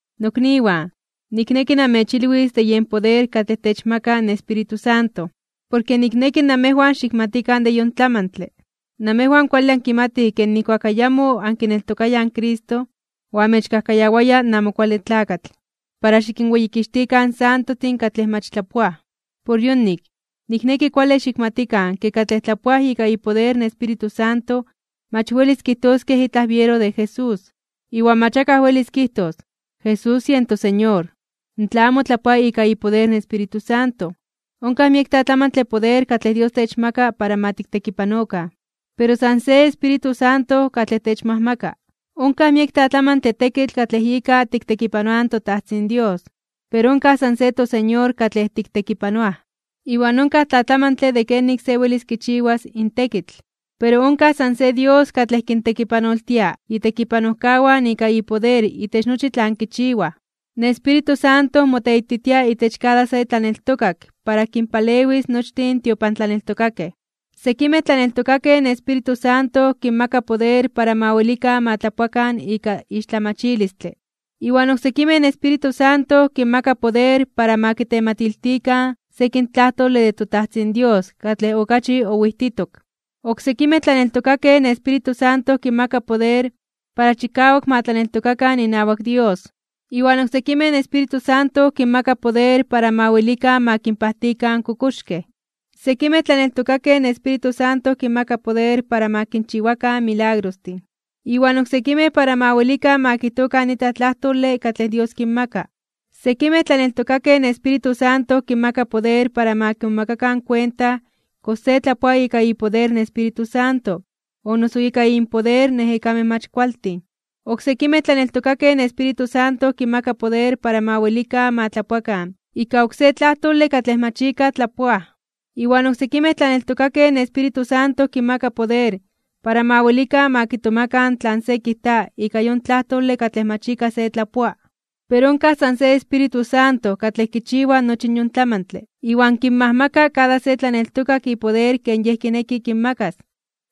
Nokniwan, nikneki namechilwis de yen poder katlej techmaka in Espíritu Santo. Porke nikneki namejwan xikmatikan de yon tlamantle. Namejwan kuale ankimatij ke nijkuak ayamo ankineltokayaj in Cristo, oamechkajkayawaya in Amo Kuale Tlakatl para xikinweyikixtikan in santojtin katlej mach tlapoaj. Por yonik, nikneki kuale xikmatikan ke katlej tlapoaj ika ipoder in Espíritu Santo mach welis kijtoskej itlaj biero de Jesús. Iwan mach akaj welis kijtos: “Jesús yen toSeñor” tla amo tlapoa ika ipoder in Espíritu Santo. Onkaj miek tlatlamantle poder katlej Dios techmaka para ma tiktekipanokan. Pero san se Espíritu Santo katlej techmajmaka. Onkaj miek tlatlamantle tekitl katlej ika tiktekipanoaj in toTajtzin Dios, pero onkaj san se toSeñor katlej tiktekipanoaj. Iwan onkaj tlatlamantle de kenik se welis kichiwas in tekitl, pero onkaj san se Dios katlej kintekipanoltia itekipanojkawan ika ipoder itech nochi tlan kichiwaj. In Espíritu Santo moteititia itech kada se tlaneltokak para kinpalewis nochtin in tiopantlaneltokakej. Sekimej tlaneltokakej in Espíritu Santo kinmaka poder para ma welikan ma tlapoakan ika ixtlamachilistle, iwan oksekimej in Espíritu Santo kinmaka poder para ma kitematiltikan sekin tlajtole de toTajtzin Dios katlej okachi owijtitok. Oksekimej tlaneltokakej in Espíritu Santo kinmaka poder para chikawak ma tlaneltokakan inawak Dios, iwan oksekimej in Espíritu Santo kinmaka poder para ma welikan ma kinpajtikan in kokoxkej. Sekimej tlaneltokakej in Espíritu Santo kinmaka poder para ma kinchiwakan milagrostin, iwan oksekimej para ma welikan ma kijtokan itlaj tlajtole katlej Dios kinmaka. Sekimej tlaneltokakej in Espíritu Santo kinmaka poder para ma kimomakakan kuenta kox se tlapoa ika ipoder in Espíritu Santo o noso ika inpoder in ejekamej mach kualtin. Oksekimej tlaneltokakej in Espíritu Santo kinmaka poder para ma welikan ma tlapoakan ika oksé tlajtole katlej mach ika tlapoaj, iwan oksekimej tlaneltokakej in Espíritu Santo kinmaka poder para ma welikan ma kitomakan tlan se kijta ika yon tlajtole katlej mach ika se tlapoa. Pero onkaj san se Espíritu Santo katlej kichiwa nochi yon tlamantle iwan kinmajmaka kada se tlaneltokak ipoder ken Yej kineki kinmakas.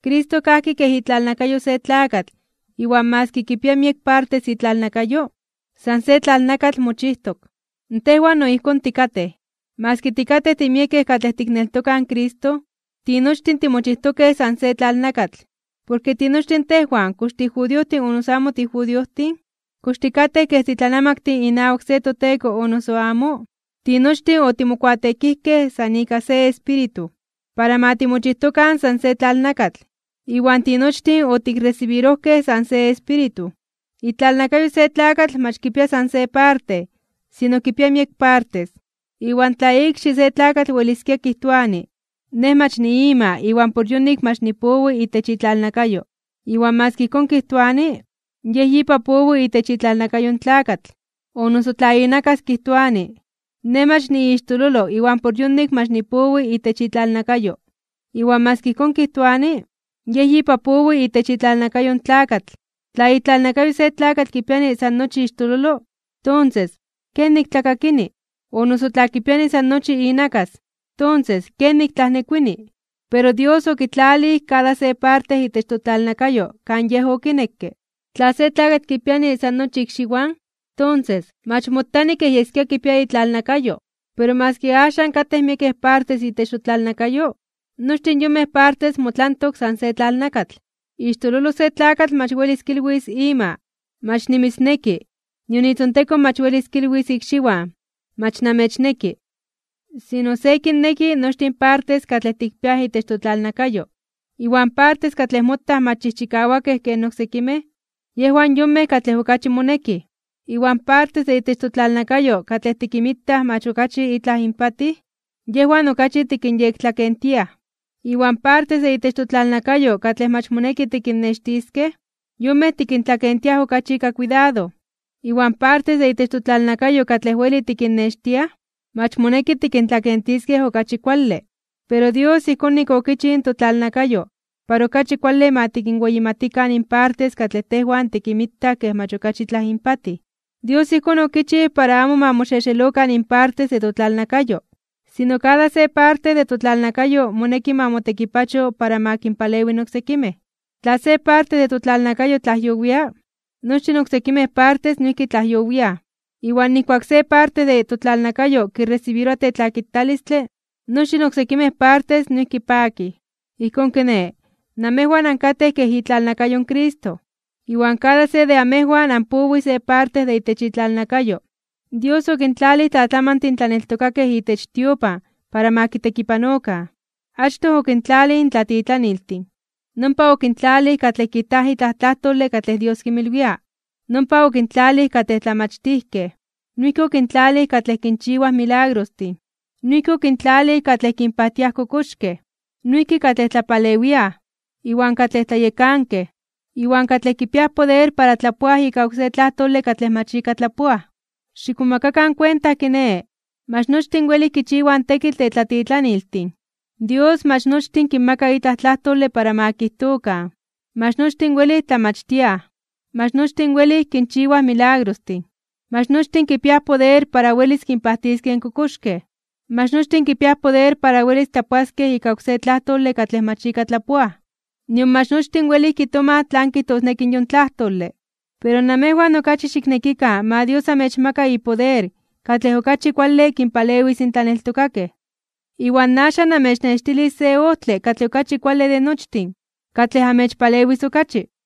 Cristo kajki kej itlalnakayo se tlakatl iwan maski kipia miek partes itlalnakayo, san se tlalnakatl mochijtok. Tejwan no ijkón tikatej. Maski tikatej timiekej katlej tikneltokaj in Cristo, tinochtin timochijtokej san se tlalnakatl. Porke tinochtin tejwan, kox tijudiojtin o noso amo tijudiojtin, kox tikatej kej titlanamaktin inawak se toteko o noso amo, tinochtin otimokuateekijkej san ika se Espíritu, para ma timochijtokan san se tlalnakatl, iwan tinochtin otikresibirojkej san se Espíritu. Itlalnakayo se tlakatl mach kipia san se parte, sino kipia miek partes. Iwan tla ikxi se tlakatl weliskia kijtoani: “Nej mach niima iwan por yonik mach nipowi itech itlalnakayo”, maski ijkón kijtoani, yej yipa powi itech itlalnakayo in tlakatl. O noso tla inakas kijtoani: “Nej mach niixtololo iwan por yonik mach nipowi itech itlalnakayo”, maski ijkón kijtoani, yej yipa powi itech itlalnakayo in tlakatl. Tla itlalnakayo se tlakatl kipiani san nochi ixtololo, tonses, ¿kenik tlakakini? O noso tla kipiani san nochi inakas, tonses, ¿kenik tlajnekuini? Pero Dios okitlalij kada se parte itech totlalnakayo kan Yej okinekke. Tla se tlakatl kipiani san nochi ikxiwan, tonses, mach motani kej yeskia kipia itlalnakayo. Pero maski axan katej miekej partes itech totlalnakayo, nochtin yonmej partes motlantok san se tlalnakatl. Ixtololo se tlakatl mach welis kilwis ima: “Mach nimitzneki”, nion itzontekon mach welis kilwis ikxiwan: “Mach namechneki.” Sino se kinneki nochtin partes katlej tikpiaj itech totlalnakayo, iwan partes katlej motaj mach chijchikawakej ken oksekimej, yejwan yonmej katlej okachi monekij. Iwan partes de itech totlalnakayo katlej tikinmitaj mach okachi itlaj inpatij, yejwan okachi tikinyektlakentiaj. Iwan partes de itech totlalnakayo katlej mach moneki tikinnextiskej, yonmej tikintlakentiaj okachi ika kuidado. Iwan partes de itech totlalnakayo katlej weli tikinnextiaj, mach moneki tikintlakentiskej okachi kuale. Pero Dios ijkón nik okichij in totlalnakayo para okachi kuale ma tikinweyimatikan in partes katlej tejwan tikinmitaj kej mach okachi itlaj inpatij. Dios ijkón okichij para amo ma moxexelokan in partes de totlalnakayo, sino kada se parte de totlalnakayo moneki ma motekipacho para ma kinpalewi in oksekimej. Tla se parte de totlalnakayo tlajyowia, nochtin in oksekimej partes noijki tlajyowiaj. Iwan nijkuak se parte de totlalnakayo kiresibiroa tetlakitalistle, nochtin oksekimej partes noijki pakij. Ijkón kiné, namejwan ankatej kej itlalnakayo in Cristo, iwan kada se de amejwan anpowij se parte de itech itlalnakayo. Dios okintlalij tlatlamantin tlaneltokakej itech tiopan para ma kitekipanokan. Achtoj okintlalij in tlatitlaniltin. Nompa, okintlalij katlej kijtaj itlaj tlajtole katlej Dios kinmilwia. Nompa, okintlalij katlej tlamachtijkej. Noijki okintlalij katlej kinchiwaj milagrostin. Noijki okintlalij katlej kinpajtiaj kokoxkej, noijki katlej tlapalewiaj, iwan katlej tlayekankej, iwan katlej kipiaj poder para tlapoaj ika oksé tlajtole katlej mach ika tlapoaj. Xikmomakakan kuenta, kiné, mach nochtin welij kichiwaj in tekitl de tlatitlaniltin. Dios mach nochtin kinmaka itlaj tlajtole para ma kijtokan. Mach nochtin welij tlamachtiaj. Mach nochtin welij kinchiwaj milagrostin. Mach nochtin kipiaj poder para welis kinpajtiskej kokoxkej. Mach nochtin kipiaj poder para welis tlapoaskej ika oksé tlajtole katlej mach ika tlapoaj. Nion mach nochtin welij kitomaj tlan kijtosneki yon tlajtole. Pero namejwan okachi xiknekikan ma Dios amechmaka ipoder katlej okachi kuale kinpalewis in tlaneltokakej. Iwan axan namechnextilis se ojtle katlej okachi kuale de nochtin, katlej amechpalewis okachi.